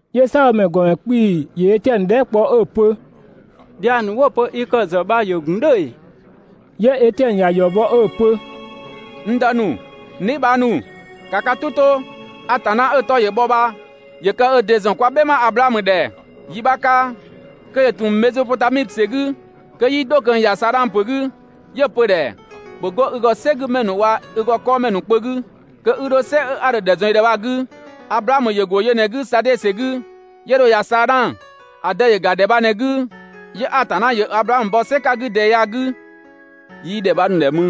'Yö "saabhomɛ ‑gɔmɛ 'kpii‑ ‑yö Etiɛnö dhɛɛ" kpɔ 'ö‑ pö: «Dhiang ‑nu 'wo‑ pö i kë‑ ‑zë bha ‑yö ‑gun "dhʋ̈ ‑ee?» 'Yö Etiɛnö ‑ya ‑yɔ bɔ 'ö‑ pö: «N dë ‑nu, n dheebhang ‑nu, ‑ka ka "tʋ 'to! Atanna 'ö‑ 'tɔ ‑yö bhɔ bha ‑yö kë ö ‑dɩ ‑zɔn kwa "bhɛma Ablaamö ‑dhɛ yi 'bha 'ka kö ‑yö ‑tun Mezopotami ‑sɛ 'gü, kö 'yii 'dho ꞊kö ‑ya Saadhang ‑pö 'gü, 'yö‑ pö‑ ‑dhɛ: «‑Bhö 'go i ‑gɔ "sɛgümɛ ‑nu waa‑ i ‑gɔ 'kɔɔmɛ ‑nu kpö 'gü kö 'i 'dho "sɛ a dho‑ ‑dhɛ ‑zɔn i ‑dhɛ bha‑ 'gü.» Ablaamö ‑yö ‑go yö ꞊në‑ 'gü Sadee ‑sɛ 'gü 'yö dho ‑ya Saadhang. ‑A dë ‑yö ‑ga ‑dhɛ bha ꞊në‑ 'gü. 'Yö Atanna ‑yö Ablaamö bɔ "sɛ 'ka‑ 'gü ꞊dɛɛ ya‑ 'gü. 'Yii ‑dhɛ 'bha nu‑ ‑dhɛ mü.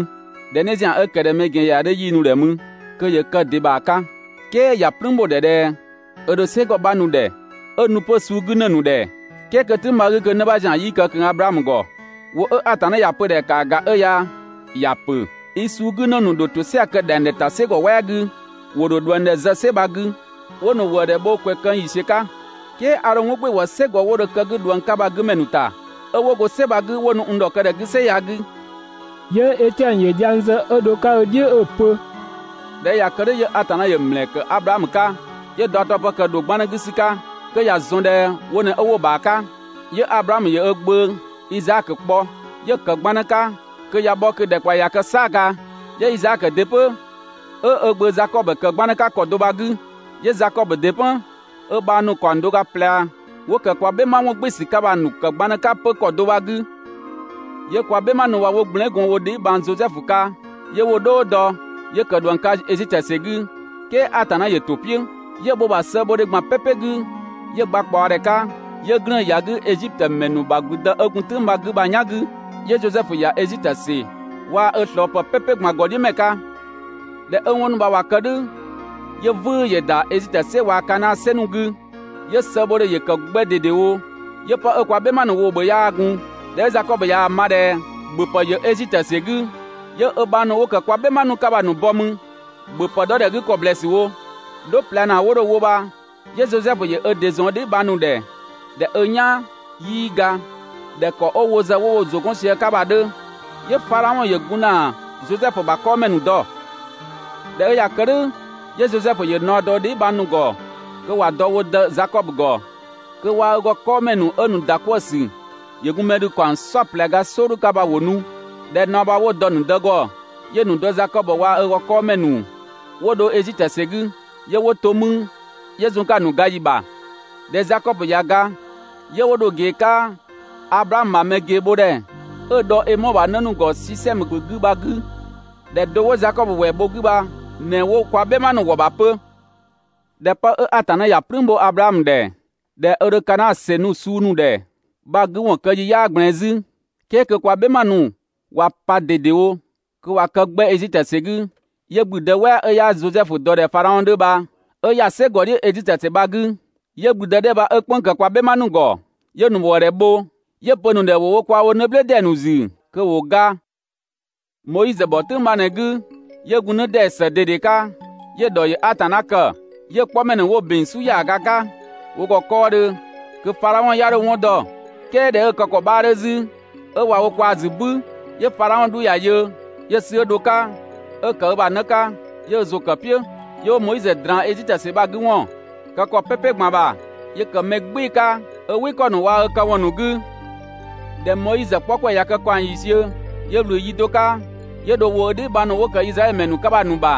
‑Dhɛ 'në ‑zian 'ö ‑kë ꞊dhɛ mɛ ‑gɛn ‑yɛa 'dhö 'yii‑ nu‑ ‑dhɛ mü kö ‑yö kë‑ ‑dɩ ‑bha 'ka, "kɛɛ ‑ya "plüün ‑bho ‑dhɛ ꞊dhɛ 'ö ‑dho "sɛgɔ bha‑ nu‑ ‑dhɛ, 'ö‑ nu 'pö‑ suu 'gü ‑në ‑nu ‑dhɛ, "kɛɛ kö‑ "tʋ̈ng bha‑ 'gü kö 'në 'bha ‑zian 'yii kë ꞊kö Ablaamö ‑gɔ. ‑Wʋ 'ö Atanna ‑ya pö‑ ‑dhɛ ‑kaa ‑ga 'ö ya, ‑ya ‑pö: ‹I suu 'gü ‑në ‑nu ‑dho ‑tosɛa kë ‑dhɛngdhɛ ‑ta "sɛgɔ "wɛɛ 'gü, ‑wo ‑dho ꞊dhuëngdhɛ zë "sɛ bha‑ 'gü 'ö 'wo‑ ‑nu ‑wëëdhɛ bho ‑kwɛ këng ‑yiisiö 'ka. "Kɛɛ a ‑dho 'wɔn "gbɩɩ‑ wɔ "sɛgɔ 'wo dho kë‑ 'gü ꞊dhuëng 'ka bha‑ 'gü ‑mɛ ‑nu ‑ta, 'ö 'wo go "sɛgɔ bha‑ 'gü 'wo nu n ‑dhɔkë ‑dhɛ 'gü "sɛ ya‑ 'gü.›» 'Yö Etiɛnö ‑yö dhiang zë 'ö dho‑ 'ka ö "dhiʋ̈ 'ö‑ pö: «꞊Dhɛ 'ö ꞊ya kë "dhʋ̈ 'yö Atanna ‑yö ‑mlɛɛ ‑kë Ablaamö 'ka, 'yö‑ daɔdɔpë ‑kë ‑dho 'gbannë 'gü ‑sü 'ka (kö ‑ya ‑zɔn ꞊dhɛ wo ꞊në 'wo ö ‑bha 'ka). 'Yö Ablaamö ‑yö ö gbö Izaakö kpɔ, 'yö‑ ‑kë 'gbannë 'ka kö ꞊ya bhɔ kö‑ ‑dhɛkpaɔyi ꞊ya kë "saaga. 'Yö Izaakö ‑dɩ 'pö 'ö ö gbö Zakɔbö ‑kë 'pö 'gbannë 'ka ‑kɔ do bha‑ 'gü. 'Yö Zakɔbö ‑dɩ 'pö 'ö ö bhang ‑nu ‑kaɔng do ga ꞊plɛ 'wo ‑kë kwa "bhɛma ‑wɔngbɩɩsü 'ka bha‑ ‑nu ‑kë 'gbannë 'ka 'pö ‑kɔ do bha‑ 'gü. 'Yö kwa "bhɛma ‑nu bha 'wo gblɛɛn" gɔn wo dheebhang Zosɛfu 'ka, 'yö 'wo‑ "dhɔɔ dɔ, 'yö kë ꞊dhuëng 'ka Ezitö ‑sɛ 'gü, "kɛɛ Atanna ‑yö ‑to "piʋ̈. 'Yö‑ bho‑ ‑bha sëëbhodhe ꞊gban "pɛpɛ 'gü 'yö‑ gba ꞊kpaɔdhɛ 'ka, 'yö 'glëën‑ ‑ya 'gü Ezitö ‑mɛ ‑nu ‑bha ‑gblüdë 'ö gun "tʋ̈ng bha‑ 'gü bha‑ "yan 'gü. 'Yö Zosɛfu ‑ya Ezitö ‑sɛ waa‑ ö ꞊slɔɔpë "pɛpɛ ꞊gban ‑gɔdhiʋ̈mɛ 'ka. ꞊Dhɛ 'ö 'wɔn ‑nu bha ‑wa kë "dhʋ̈, 'yö "vʋ̈ʋ̈ ‑yö ‑da Ezitö ‑sɛ waa‑ Kanaa ‑sɛ ‑nu 'gü, 'yö‑ sëëbhodhe ‑yö ‑kë 'gbɛ ꞊dedewo, 'yö 'pë 'ö kwa "bhɛma ‑nu woo‑ ‑bhö 'yaa gun. ꞊Dhɛ 'ö Zakɔbö ꞊yaa‑ ma ꞊dhɛ ‑bhöpë ‑yö Ezitö ‑sɛ 'gü, 'yö ö bhang ‑nu 'wo ‑kë kwa "bhɛma ‑nu 'ka bha‑ ‑nu bɔ 'mü, ‑bhöpë 'dhɔ ‑dhɛ 'gü ‑kɔ ‑blɛɛsü wo. 'Dho ꞊plɛ ‑naa 'dhɛ 'wo dho‑ wo bha 'yö Zosɛfu ‑yö ö ‑dɩ ‑zɔn ö dheebhang ‑nu ‑dhɛ (꞊dhɛ 'ö "yaan, 'yii ga ꞊dhɛ ‑kɔ 'ö wo ‑zë 'wo gun wo ‑zʋ 'gɔn sië‑ 'ka bha‑ 'dhö), 'yö Fadhaɔn ‑yö gun ‑na Zosɛfu ‑bha 'kɔɔmɛ ‑nu dɔ. ꞊Dhɛ 'ö ꞊ya kë "dhʋ̈ 'yö Zosɛfu ‑yö naɔ dɔ 'ö dheebhang ‑nu bha‑ ‑nu ‑gɔ kö ‑wa dɔ wo dë Zakɔbö ‑gɔ kö waa‑ ö ‑gɔ 'kɔɔmɛ ‑nu 'ö‑ ‑nu ‑da 'kwëë‑ ‑sü ‑yö gun mɛ ‑dhü ‑kaɔng "saɔplɛ ga "sɔɔdhu bha ‑wo nu. ꞊Dhɛ naɔ bha 'wo‑ dɔ‑ ‑nu dë ‑gɔ, 'yö‑ ‑nu dë Zakɔbö waa‑ ö ‑gɔ 'kɔɔmɛ ‑nu 'wo dho Ezitö ‑sɛ 'gü. 'Yö 'wo to 'mü 'yö zun‑ 'ka‑ ‑nu ga ‑yi ‑bha. ꞊Dhɛ Zakɔbö ꞊ya ga, 'yö 'wo dho‑ ꞊gee 'ka Ablaamö ‑bha mɛ ꞊geebhodhɛ 'ö‑ dhɔ Emɔɔ ‑bha 'në ‑nu ‑gɔ Sisɛmö ‑pö 'gü bha‑ 'gü. ‑Dhɛ do 'wo Zakɔbö ꞊wɛɛ bho‑ 'gü bha ꞊në 'wo kwa "bhɛma ‑nu ‑wɔ ‑bha 'pö. ꞊Dhɛ 'ö 'pë 'ö Atanna ‑ya "plüün bho Ablaamö ‑dhɛ (꞊dhɛ ö ‑dho Kanaa ‑sɛ nu‑ suu ‑nu ‑dhɛ) bha‑ 'gü ‑wɔn kë ‑yi 'yaa ꞊gblɛɛn 'zü, "kɛɛ kö kwa "bhɛma ‑nu ꞊wa pa ꞊dedewo kö ꞊wa kë 'gbɛ Ezitö ‑sɛ 'gü, 'yö ‑gblüdë "wɛɛ 'ö 'yaa Zosɛfu dɔ ꞊dhɛ Fadhaɔn 'dhö bha 'ö ‑ya "sɛgɔ "dhiʋ̈ Ezitö ‑sɛ bha‑ 'gü. 'Yö ‑gblüdë 'dhɛ 'ö bha 'ö "kpënng‑ ‑kë kwa "bhɛma ‑nu ‑gɔ, 'yö‑ ‑nu ‑wëëdhɛ bho, 'yö‑ pö‑ ‑nu ‑dhɛ ‑wo wo kwaa‑ woo‑ 'në "blë ‑dee ‑nu ‑zü kö ‑wo ga. Moizö ‑bhɔ "tʋ̈ng bha ꞊në‑ 'gü, 'yö gun 'në ‑dee ‑së ꞊dede 'ka, 'yö‑ ‑dhɔ ‑yö Atanna kë. 'Yö‑ 'kpɔmɛ ‑nu 'wo‑ ‑bin "su ‑yaaga 'ka wo ‑gɔ 'kɔɔdhö (kö Fadhaɔn 'ya 'dho‑ 'wɔn dɔ). "Kɛɛ ꞊dhɛ 'ö‑ kë ‑kɔ 'bhaa 'dhö 'zü, 'ö ꞊wa wo kwaa‑ ‑zü "bü, 'yö Fadhaɔn 'dhu ‑ya yö, 'yö‑ sü 'ö dho‑ 'ka 'ö‑ ‑kë ö ‑bha 'në 'ka 'yö ö ‑zʋ ‑kë "piʋ̈. 'Yö 'wo Moizö ꞊draan Ezitö ‑sɛ bha‑ 'gü ‑wɔn kë ‑kɔ "pɛpɛ ꞊gban ‑bha, 'yö ‑kë mɛ "gbɩɩ‑ 'ka ö "wɩ ‑kɔ ‑nu waa‑ ö këwɔn ‑nu 'gü. ꞊Dhɛ Moizö 'kpɔ ‑kwɛ ꞊ya kë ‑kaɔng ‑yiisiö, 'yö ꞊wlü yi do 'ka, 'yö dho ‑wo ö dheebhang ‑nu 'wo ‑kë Izraɛdhö ‑mɛ ‑nu 'ka bha‑ ‑nu ‑bha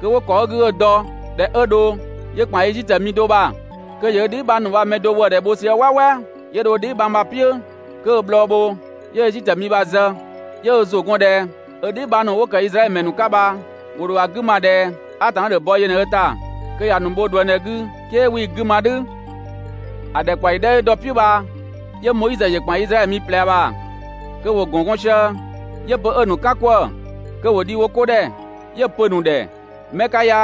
kö 'wo ‑kɔ 'ö‑ 'gü 'ö‑ dɔ. ꞊Dhɛ 'ö dho 'yö ‑kpan Ezitö mi do ‑bha kö ‑yö ö dheebhang ‑nu bha‑ mɛ do ‑wëëdhɛ bho sië "wɛɛwɛɛ, 'yö dho ö dheebhang bha‑ "piʋ̈ kö ö‑ bhlɔɔ bho, 'yö Ezitö mi bha‑ zë. 'Yö ö ‑zʋ ‑gɔn ꞊dhɛ ö dheebhang ‑nu 'wo ‑kë Izraɛdhö ‑mɛ ‑nu 'ka bha, ‑wo ‑dho ‑a 'gü ma ꞊dhɛ Atanna ‑dho bɔ yö ꞊në ö ‑ta kö ‑ya ‑nu bho ꞊dhuëngdhɛ 'gü, "kɛɛ 'wii‑ 'gü ma "dhʋ̈. ‑A ‑dhɛkpaɔyi 'dhɛ 'ö dɔ‑ "piʋ̈ bha, 'yö Moizö ‑yö ‑kpan Izraɛdhö mi ꞊plɛ ‑bha kö ‑wo ‑gɔn gɔn sië, 'yö‑ pö 'ö‑ ‑nu "kan 'kwëë‑ kö ‑wo dhi wo 'ko ‑dhɛ 'yö‑ pö‑ ‑nu ‑dhɛ: ‹'Mɛ 'ka ya,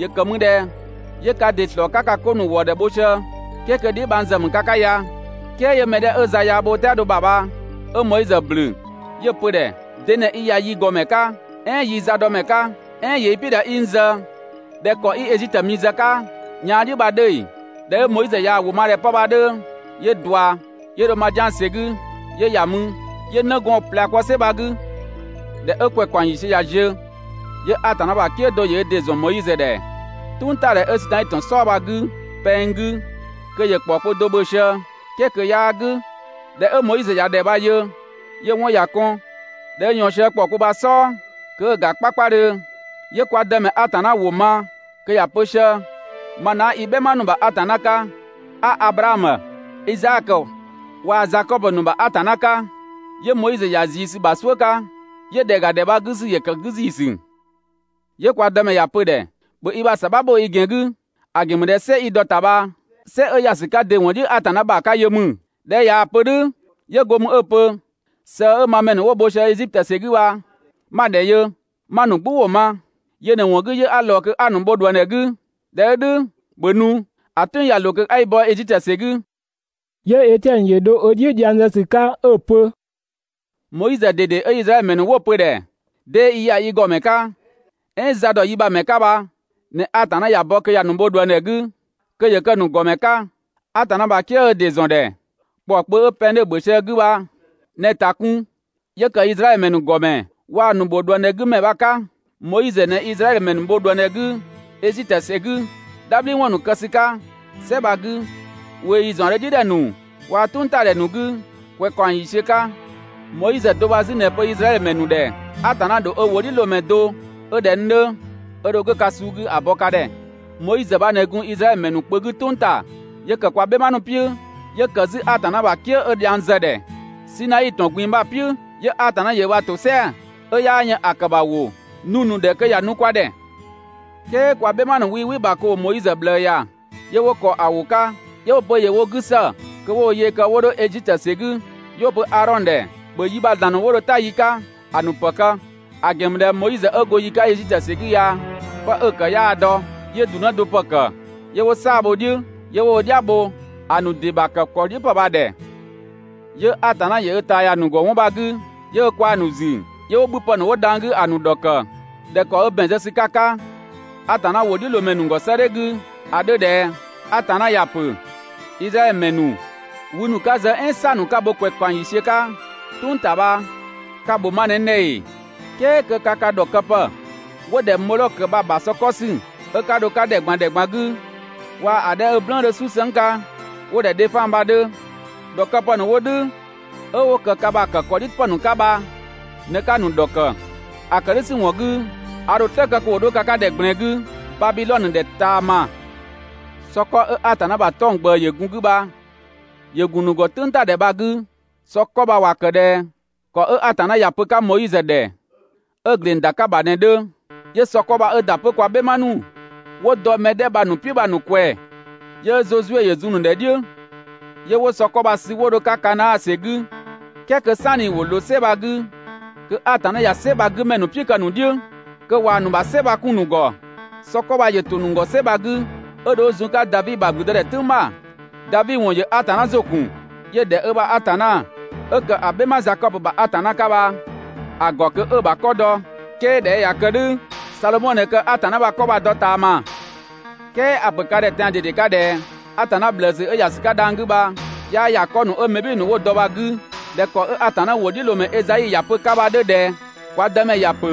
‑yö ‑kë mü ꞊dhɛ 'yö ka ‑dɩ ‑slɔɔ 'ka ka 'ko ‑nu ‑wëë ‑kë wo sië "kɛɛ kö dheebhang ‑zë ‑mü ka 'ka ya?› "Kɛɛ 'yö‑ mɛ 'dhɛ 'ö za yaa bho ö "tɛado ‑bha bha 'ö Moizö ‑blü, 'yö‑ pö‑ ‑dhɛ: ‹De ꞊në i ‑ya yi ‑gɔmɛ 'ka "ɛɛn yii‑ zadɔmɛ 'ka? "Ɛɛn ‑yö i "piʋ̈ ꞊dhɛ 'i n zë ꞊dhɛ ‑kɔ 'i Ezitö mi zë‑ 'ka yaan "dhiʋ̈ bha‑ 'dhö ‑ee?› ꞊Dhɛ 'ö Moizö ꞊yaa‑ ‑wʋ ma ꞊dhɛ 'pë bha‑ 'dhö, 'yö ꞊dua 'yö dho Madian ‑sɛ 'gü 'yö ‑ya mü, 'yö 'nëgɔɔn ꞊plɛ kpɔ "sɛ bha‑ 'gü. ꞊Dhɛ 'ö ‑kwɛ ‑kaɔng ‑yiisiö ꞊ya ziö, 'yö Atanna ‑bha "kië do ‑yö ö ‑dɩ ‑zɔn Moizö ‑dhɛ "tʋngtadhɛ 'ö Sinai ‑tɔn "sɔɔ bha‑ 'gü pɛng 'gü kö ‑yö ‑kpɔɔkpö do ‑bhö sië ("kɛɛ kö 'yaa "gʋ̈). ꞊Dhɛ 'ö Moizö ꞊ya ‑dhɛ bha‑ yö 'yö‑ 'wɔn ‑ya kɔn. ꞊Dhɛ 'ö ꞊yɔɔn sië ‑kpɔɔkpö bha‑ "sɔɔ kö 'ö‑ ‑ga 'kpakpadhö, 'yö kwa Dëmɛ Atanna ‑wʋ ma kö ‑ya pö sië: ‹Ma ꞊në 'a i "bhɛma ‑nu ‑bha Atanna 'ka, 'a Ablaamö, Izaakö waa‑ Zakɔbö ‑nu ‑bha Atanna 'ka.› 'Yö Moizö ‑yö ‑ya ꞊zii ‑sü ‑bha "suʋ̈ 'ka, 'yö ‑dhɛ ‑ga ‑dhɛ bha‑ 'gü ‑sü ‑yö ‑kë 'gü ‑ziisü. 'Yö kwa Dëmɛ ‑ya pö‑ ‑dhɛ: «‑Bhö i ‑bha ‑sabha bho i ‑gɛn 'gü, ‑a ‑gɛn ‑mü ꞊dhɛ "sɛ 'i dɔ‑ ‑ta bha "sɛ 'ö ‑ya ‑sü 'ka ‑dɩ ‑wɔn "dhiʋ̈ Atanna ‑bha 'ka yö ‑mü.» ꞊Dhɛ 'ö ꞊yaa‑ pö‑ ‑dhɛ "dhʋ̈, 'yö go mü 'ö‑ pö: «Sëë 'ö ma mɛ ‑nu 'wo‑ bho sië Ezitö ‑sɛ 'gü bha 'ma‑ ‑dhɛ yö, 'ma‑ ‑nu "gbʋ ‑wʋ ma; Yö ꞊në‑ ‑wɔn 'gü 'yö 'a ꞊lɔɔ kö 'a‑ ‑nu bho ꞊dhuëngdhɛ 'gü. ꞊Dhɛ 'ö "dhʋ̈, ‑bhö nu, ‑a "tʋ̈ng ꞊ya ꞊loo kö 'a i bɔ Ezitö ‑sɛ 'gü!» 'Yö Etiɛnö ‑yö dho ö "dhiʋ̈ dhiang zë ‑sü 'ka 'ö‑ pö: «Moizö ꞊dede 'ö Izraɛdhö ‑mɛ ‑nu 'wo‑ pö‑ ‑dhɛ: ‹'Dee i ‑ya yi ‑gɔmɛ 'ka "ɛɛn za ‑dɔ yi ‑bha ‑mɛ 'ka› bha ꞊në Atanna ‑ya bɔ kö ‑ya ‑nu bho ꞊dhuëngdhɛ 'gü kö ‑yö kë‑ ‑nu ‑gɔmɛ 'ka. Atanna ‑bha "kië 'ö ö ‑dɩ ‑zɔn ‑dhɛ ‑kpɔɔ kpö 'ö pɛng 'dhö ‑bhö sië‑ 'gü bha ꞊në‑ ‑ta kun kö ‑yö kë Izraɛdhö ‑mɛ ‑nu ‑gɔmɛ waa‑ ‑nu ‑bho ꞊dhuëngdhɛ 'gü ‑mɛ bha‑ 'ka. Moizö ꞊në Izraɛdhö ‑mɛ ‑nu bho ꞊dhuëngdhɛ 'gü Ezitö ‑sɛ 'gü, "dhabhliwɔn ‑nu kë ‑sü 'ka "sɛ bha‑ 'gü, ꞊weeyi ‑zaɔndhö "dhiʋ̈ ‑dhɛ ‑nu waa‑ "tʋngtadhɛ ‑nu 'gü ‑kwɛ ‑kaɔng ‑yiisiö 'ka. Moizö do bha 'zü ꞊në‑ pö Izraɛdhö ‑mɛ ‑nu ‑dhɛ: ‹Atanna ‑dho ö ‑wʋdhiʋ̈loomɛ do 'ö ꞊dhɛ n 'dhö, ö dho 'go ka suu 'gü ‑a bɔ ka ‑dhɛ›. Moizö bha ꞊në gun Izraɛdhö ‑mɛ ‑nu kpö 'gü "tʋng ‑ta. 'Yö ‑kë kwa "bhɛma ‑nu "piʋ̈, 'yö ‑kë 'zü Atanna ‑bha "kië 'ö dhiang zë‑ ‑dhɛ Sinai ‑tɔn ꞊gbin‑ bha‑ "piʋ̈, 'yö Atanna ‑yö ö ‑bha ‑tosɛa 'ö 'yaa yën ‑a ‑kë ‑bha ‑wʋ ‑nu nu‑ ‑dhɛ kö ‑ya nu kwa ‑dhɛ. "Kɛɛ kwa "bhɛma ‑nu 'wii "wɩ‑ ‑bha kö ‑wo Moizö ꞊bhlëë ‑ya, 'yö 'wo ‑kɔ ‑a ‑wʋ 'ka 'yö 'wo‑ pö ‑yö wo 'gü ‑së kö 'wo wo yee kë 'wo 'dho Ezitö ‑sɛ 'gü. 'Yö 'wo‑ pö Aadhɔn ‑dhɛ: «‑Bhö yi ‑bha ‑zlan ‑nu 'wo dho "ta yi 'ka ‑a ‑nu ‑pë kë! ‑A ‑gɛn ‑mü ꞊dhɛ Moizö 'ö go yi 'ka Ezitö ‑sɛ 'gü ya 'pë 'ö‑ ‑kë 'yaa‑ ‑dɔ!› 'Yö ‑du 'në do ‑pë ‑kë, 'yö 'wo "saa‑ bho‑ "dhiʋ̈, 'yö 'wo wo "dhia bho‑ ‑nu ‑dɩ ‑bha ‑kë ‑kɔ "dhiʋ̈ ‑pë bha‑ ‑dhɛ. 'Yö Atanna ‑yö ö ꞊taa ‑ya ‑nu ‑gɔ 'wɔn bha‑ 'gü, 'yö ö ꞊kwaa‑ ‑nu ‑zü 'yö 'wo 'bhüpë ‑nu 'wo dhang‑ 'gü ‑a ‑nu ‑dhɔkë ꞊dhɛ ‑kɔ 'ö ‑bɛn zë ‑sü 'ka‑ 'ka Atanna ‑wʋdhiʋ̈loomɛ ‑nu ‑gɔ 'sëëdhɛ 'gü ‑a 'dhö ꞊dhɛ: ‹Atanna ‑ya ‑pö: Izraɛdhö ‑mɛ ‑nu, wü ‑nu 'ka‑ zë "ɛɛn "saa‑ ‑nu 'ka‑ bho ‑kwɛ ‑kaɔng ‑yiisiö 'ka "tʋng ‑ta bha, ka‑ ‑bho ma ꞊në n ‑dhɛ ‑ee? "Kɛɛ kö ka kë ‑dhɔkëpë 'wo‑ ‑dhɛ Mɔdhɔkö bha‑ ‑bha sɔ 'kɔ ‑sü 'ö 'ka dho‑ 'ka ‑dhɛ ꞊gban ‑dhɛ ꞊gban 'gü, waa‑ 'dhɛ 'ö‑ "blɛɛn‑ 'dhö "susëng 'ka 'wo‑ ‑dhɛ Dhefan bha‑ 'dhö. ‑Dhɔkëpë ‑nu 'wo "dhʋ̈ 'ö 'wo ‑kë ka ‑bha ‑kë ‑kɔ "dhiʋ̈ ‑pë ‑nu 'ka bha ꞊në 'ka‑ ‑nu ‑dhɔkë. ‑A ‑kë "dhʋ̈ ‑sü ‑wɔn 'gü, a ‑dho "slë kë kö ‑wo 'dho ka 'ka ‑dhɛ ꞊gblɛɛn 'gü Babidhɔnö ‑dhɛ ꞊taama› Sɔ 'kɔ 'ö Atanna ‑bha 'tɔng‑ ꞊gbëë ‑yö gun‑ 'gü bha ‑yö ‑gun ‑nu ‑gɔ "tʋngtadhɛ bha‑ 'gü. Sɔ 'kɔ bha ‑wa ‑kë ꞊dhɛ ‑kɔ 'ö Atanna ‑ya pö‑ 'ka Moizö ‑dhɛ 'ö‑ ‑gleng ‑da 'ka‑ ‑bha bha ꞊në‑ 'dhö. 'Yö sɔ 'kɔ bha 'ö ‑da 'pö kwa "bhɛma ‑nu 'wo dɔ mɛ 'dhɛ bha‑ ‑nu "piʋ̈ bha‑ ‑nu ꞊kwɛɛ‑, 'yö Zozue ‑yö zun‑ ‑nu ‑dhɛ "dhiʋ̈ 'yö 'wo sɔ 'kɔ bha‑ sü 'wo dho‑ 'ka Kanaa ‑sɛ 'gü. "Kɛɛ kö "sanni ‑wo ꞊loo "sɛ bha‑ 'gü kö Atanna ꞊ya "sɛ bha‑ 'gü ‑mɛ ‑nu "piʋ̈ kë‑ ‑nu "dhiʋ̈, kö ꞊waa‑ ‑nu ‑bha "sɛ bha‑ 'kun‑ ‑nu ‑gɔ. Sɔ 'kɔ bha ‑yö ‑to ‑nu ‑gɔ "sɛ bha‑ 'gü 'ö dho 'ö zun‑ 'ka Davi ‑bha ‑gblüdëdhɛ "tʋ̈ng ‑bha. Davi ‑wɔn ‑yö Atanna ‑zʋ ‑kun. 'Yö‑ ‑dhɛ ö ‑bha Atanna 'ö ‑kë ‑a "bhɛma Zakɔbö ‑bha Atanna 'ka bha‑ ‑gɔ kö 'ö‑ ‑bha 'kɔ dɔ. "Kɛɛ ꞊dhɛ 'ö ꞊ya kë "dhʋ̈, Sadhomɔ ꞊në kë Atanna ‑bha 'kɔ bha‑ dɔ ꞊taama. "Kɛɛ a‑ ‑pö ka ‑dhɛ tɛan‑ ꞊dede 'ka ꞊dhɛ Atanna ꞊bhlëësü 'ö ‑ya ‑sü 'ka dhang‑ 'gü bha, 'yaa ‑ya 'kɔ ‑nu 'ö mɛ "bhɩɩ‑ ‑nu 'wo‑ dɔ bha‑ 'gü ꞊dhɛ ‑kɔ 'ö Atanna ‑wʋdhiʋ̈loomɛ Ezai ‑ya pö‑ 'ka bha‑ 'dhö ꞊dhɛ: ‹Kwa Dëmɛ ‑ya ‑pö: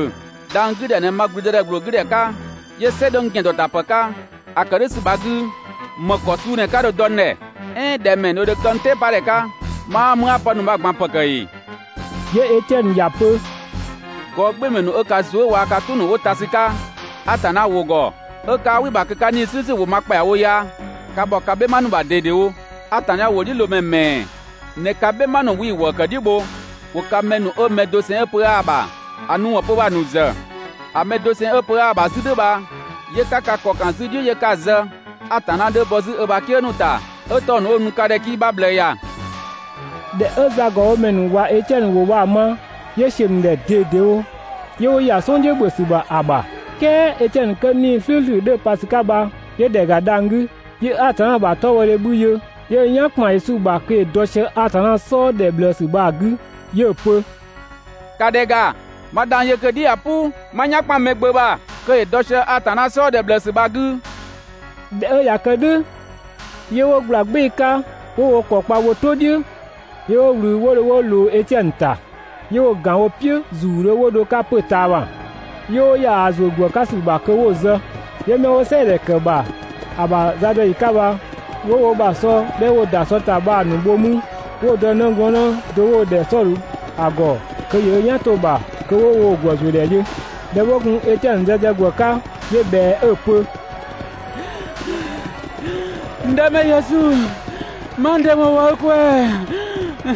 Dhang‑ 'gü ‑dhɛ ꞊në ma ‑blüdëdhɛ ‑gbloo 'gü ‑dhɛ 'ka, 'yö "sɛ 'dhö n ‑gɛndɔtapë 'ka. ‑A ‑kë "dhʋ̈ ‑sü bha‑ 'gü ‑më ‑kɔ suu ꞊në 'ka dho‑ dɔ n ‑dhɛ? "Ɛɛn ‑dhɛ ‑mɛɛ ꞊në dho kë n "tɛɛpadhɛ 'ka? Ma 'aa mü 'a pë ‑nu bha‑ ꞊gban ‑pë ‑kë ‑ee?› 'Yö Etiɛnö ‑ya pö: «Gɔɔgbɩɩmɛ ‑nu 'ö ka zuë" waa‑ ka "tʋ ‑nu 'wo ta ‑sü 'ka Atanna ‑wʋ ‑gɔ 'ö 'kaa "wɩ‑ ‑bha kö 'ka 'Nii‑ "slʋ̈ʋ̈slʋ̈ ‑wʋ ma ‑kpɛawo ya, ka ‑bhɔ ka "bhɛma ‑nu ‑bha ꞊dedewo. Atanna ‑wʋdhiʋ̈loomɛ ‑mɛɛ ꞊në ka "bhɛma ‑nu 'wii‑ ‑wëë ‑kë "dhiʋ̈ bho? ‑Wo ka 'mɛ ‑nu 'wo mɛ doseng 'ö pö 'aa‑ ‑bha ‑a nu ‑wɔn 'pö bha‑ ‑nu ‑zë. ‑A mɛ doseng 'ö pö 'aa‑ ‑bha 'zü "dhʋ̈ bha 'yö 'ka ka ‑kɔ ‑kan 'zü‑ "dhiʋ̈ 'yö 'ka‑ zë. Atanna 'dhö bɔ 'zü ö ‑bha "kië ‑nu ‑ta 'ö 'tɔng‑ 'ö‑ nu ka ‑dhɛ 'kii‑ 'bha ꞊bhlëë ‑ya.» ꞊Dhɛ 'ö zagɔbhomɛ ‑nu ꞊wa Etiɛnö ‑wʋ bha‑ ma, 'yö ‑siö ‑nu ‑dhɛ ꞊dedewo 'yö 'wo ‑ya "sɔn "dhiʋ̈ ‑bhö ‑sü ‑bha ‑a ‑bha. "Kɛɛ Etiɛnö 'kö 'Nii‑ "slʋ̈ʋ̈slʋ̈ 'dhö‑ pa ‑sü 'ka bha, 'yö ‑dhɛ ‑ga dhang‑ 'gü, 'yö Atanna ‑bha 'tɔbhɔdhe 'bhü yö, 'yö ö "yan ‑kpan Yesu ‑bha kö ‑yö dɔ sië Atanna "sɔɔ ‑dhɛ ꞊bhlëësü bha‑ 'gü 'yö‑ pö: «‑Ka ‑dhɛ ‑ga! 'Ma dhang‑ yö kö‑ "dhi ꞊ya "pʋ, ma n "yan ‑kpan Mɛgbömɛ ‑bha kö ‑yö dɔ sië Atanna "sɔɔ ‑dhɛ ꞊bhlëësü bha‑ 'gü.» ꞊Dhɛ 'ö ꞊ya kë "dhʋ̈, 'yö 'wo ꞊gbla "gbɩɩ‑ 'ka 'wo wo ‑kɔ kpa wo "tʋ "dhiʋ̈ 'yö 'wo ꞊wlü 'wo dho 'wo ꞊loo Etiɛnö ‑ta. 'Yö 'wo‑ ‑gan wo "piʋ̈ ‑zuudhö 'wo dho‑ 'ka 'pö‑ ꞊taama, 'yö 'wo ‑ya ‑a ‑zuö ‑gwë 'ka ‑sü ‑bha kö 'wo‑ zë. 'Yö 'mɛ 'wo "sɛɛdhɛ ‑kë ‑bha ‑a ‑bha zadɔyi 'ka bha, 'wo wo ‑bha sɔ 'dhɛ 'wo‑ ‑da sɔ ‑ta bha‑ ‑nu bho 'mü 'wo‑ dɔ 'nëglɔɔnnë do 'wo‑ ‑dhɛ Sɔdhö ‑a ‑gɔ kö ‑yö ö "yan 'to‑ ‑bha kö 'wo woo‑ ‑gwë ‑zuö ‑dhɛ yö. ꞊Dhɛ 'wo gun Etiɛnö zë sië ‑gwë 'ka, 'yö ꞊bhɛa 'ö‑ pö: «N Dëmɛ Yesu, ma n ‑dɩ ‑wɔn wɔ i ꞊kwɛɛ‑!»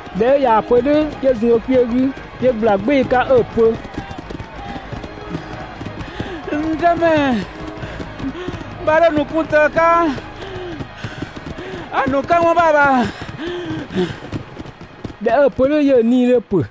꞊Dhɛ 'ö ꞊yaa‑ pö "dhʋ̈ 'yö zun ö kpiö 'gü 'yö ꞊gbla "gbɩɩ‑ 'ka 'ö‑ pö: «N Dëmɛ, 'bha 'dho‑ ‑nu 'kun tëë 'ka ‑a ‑nu këwɔn bha‑ ‑bha!» ꞊Dhɛ 'ö‑ pö "dhʋ̈ 'yö‑ 'nii‑ 'dhö ‑pö.